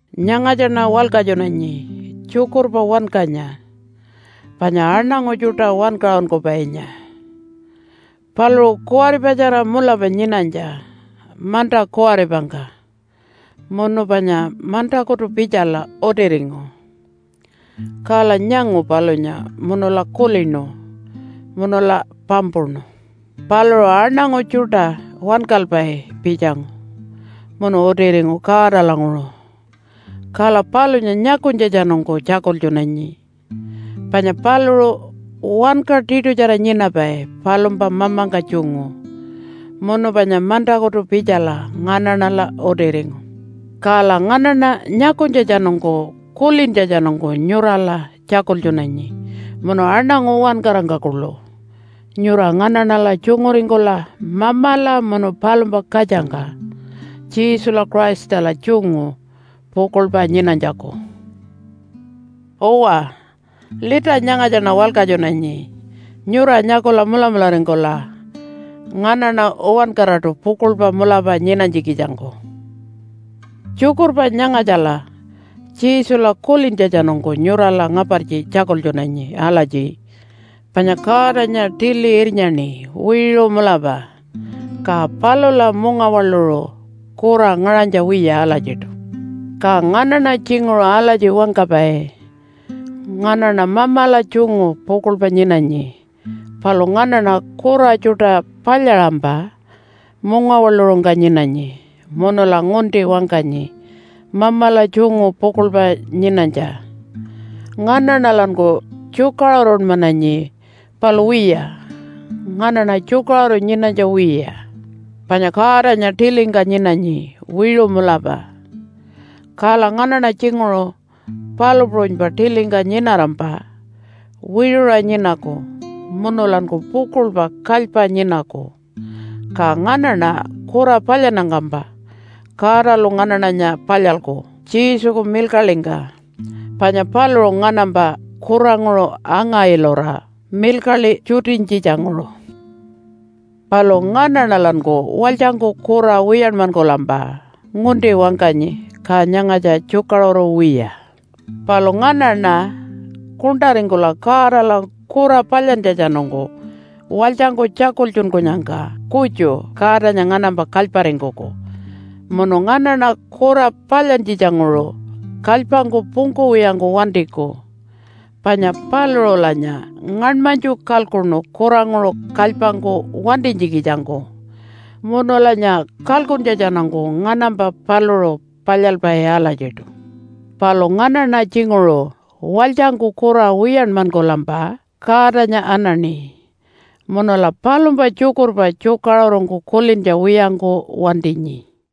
Nyangatjaṉa walkatjunanyi tjukurpa wankanya panya aṉangu tjuṯa wankaṟunkupainya. Paluṟu kuwaripatjara mulapa nyinanytja manta kuwaripangka munu panya mantakutu pitjala utiringu. Kala nyangu palunya munula kulinu munula pampuṉu. Paluṟu aṉangu tjuṯa wankalpai pitjangu munu utiringu Godalanguṟu. Kala palunya nyakunytjatjanungku tjakultjunanyi. Panya paluṟu wanka tiṯutjara nyinapai palumpa Mamangka tjungu munu panya mantakutu pitjala nganaṉala utiringu. Kala nganaṉa nyakunytjatjanungku kulintjatjanungku nyurala tjakultjunanyi munu aṉangu uwankarangka kuḻu, nyura nganaṉala tjunguringkula Mamala munu palumpa katjangka Jesula Christala tjungu pukuḻpa nyinanytjaku. Uwa, lita nyangatjaṉa walkatjunanyi nyura nyakula mulamularingkula nganaṉa uwankaraṯu pukuḻpa mulapa nyinanytjikitjangku. Tjukurpa nyangatjala Jesula kulintjatjanungku nyurala ngapartji tjakultjunanyi alatji, panya Godanya tili irnyaṉi wiṟu mulapa, ka palula mungawaḻuṟu kura ngaṟanytja wiya alatjiṯu. Ka nganaṉa tjinguṟu alatji wangkapai, “Nganaṉa Mamala tjungu pukuḻpa nyinanyi.” Palu nganaṉa kura tjuṯa palyaṟampa mungawaḻuṟungka nyinanyi, munula ngunti wangkanyi Mamala tjungu pukuḻpa nyinanytja. Nganaṉalanku tjukaṟurunmananyi, palu wiya, nganaṉa tjukaṟuru nyinanytja wiya. Panya Godanya tilingka nyinanyi wiṟu mulapa. Kala nganaṉa tjinguṟu palu puṟunypa tilingka nyinarampa wiṟuṟa nyinaku munulanku pukuḻpa kalypa nyinaku. Ka nganaṉa kura palyannyangkampa Godalu nganaṉanya palyalku Jesuku milkaḻingka, panya paluṟu nganampa kuranguṟu anga-ilura milkaḻi tjutinytjitjanguṟu. Palu nganaṉalanku walytjangku kura wiyanmankulampa ngunti wangkanyi. Ka nyangatja tjukaṟuru wiya. Palu nganaṉa kuṉṯaringkula Godala kura palyantjatjanungku walytjangku tjakultjunkunyangka kutju Godanya nganampa kalyparingkuku munu nganaṉa kura palyantjitjanguṟu kalypangku pungkuwiyangku wantiku, panya paluṟulanya ngaṉmanytju kalkuṉu kuranguṟu kalypangku wantinytjikitjangku, munulanya kalkuntjatjanungku nganampa paluṟu palyalpai alatjiṯu. Palu nganaṉa tjinguṟu walytjangku kura wiyanmankulampa Godanya anaṉi. Munula palumpa tjukurpa tjukaṟurungku kulintja wiyangku wantinyi.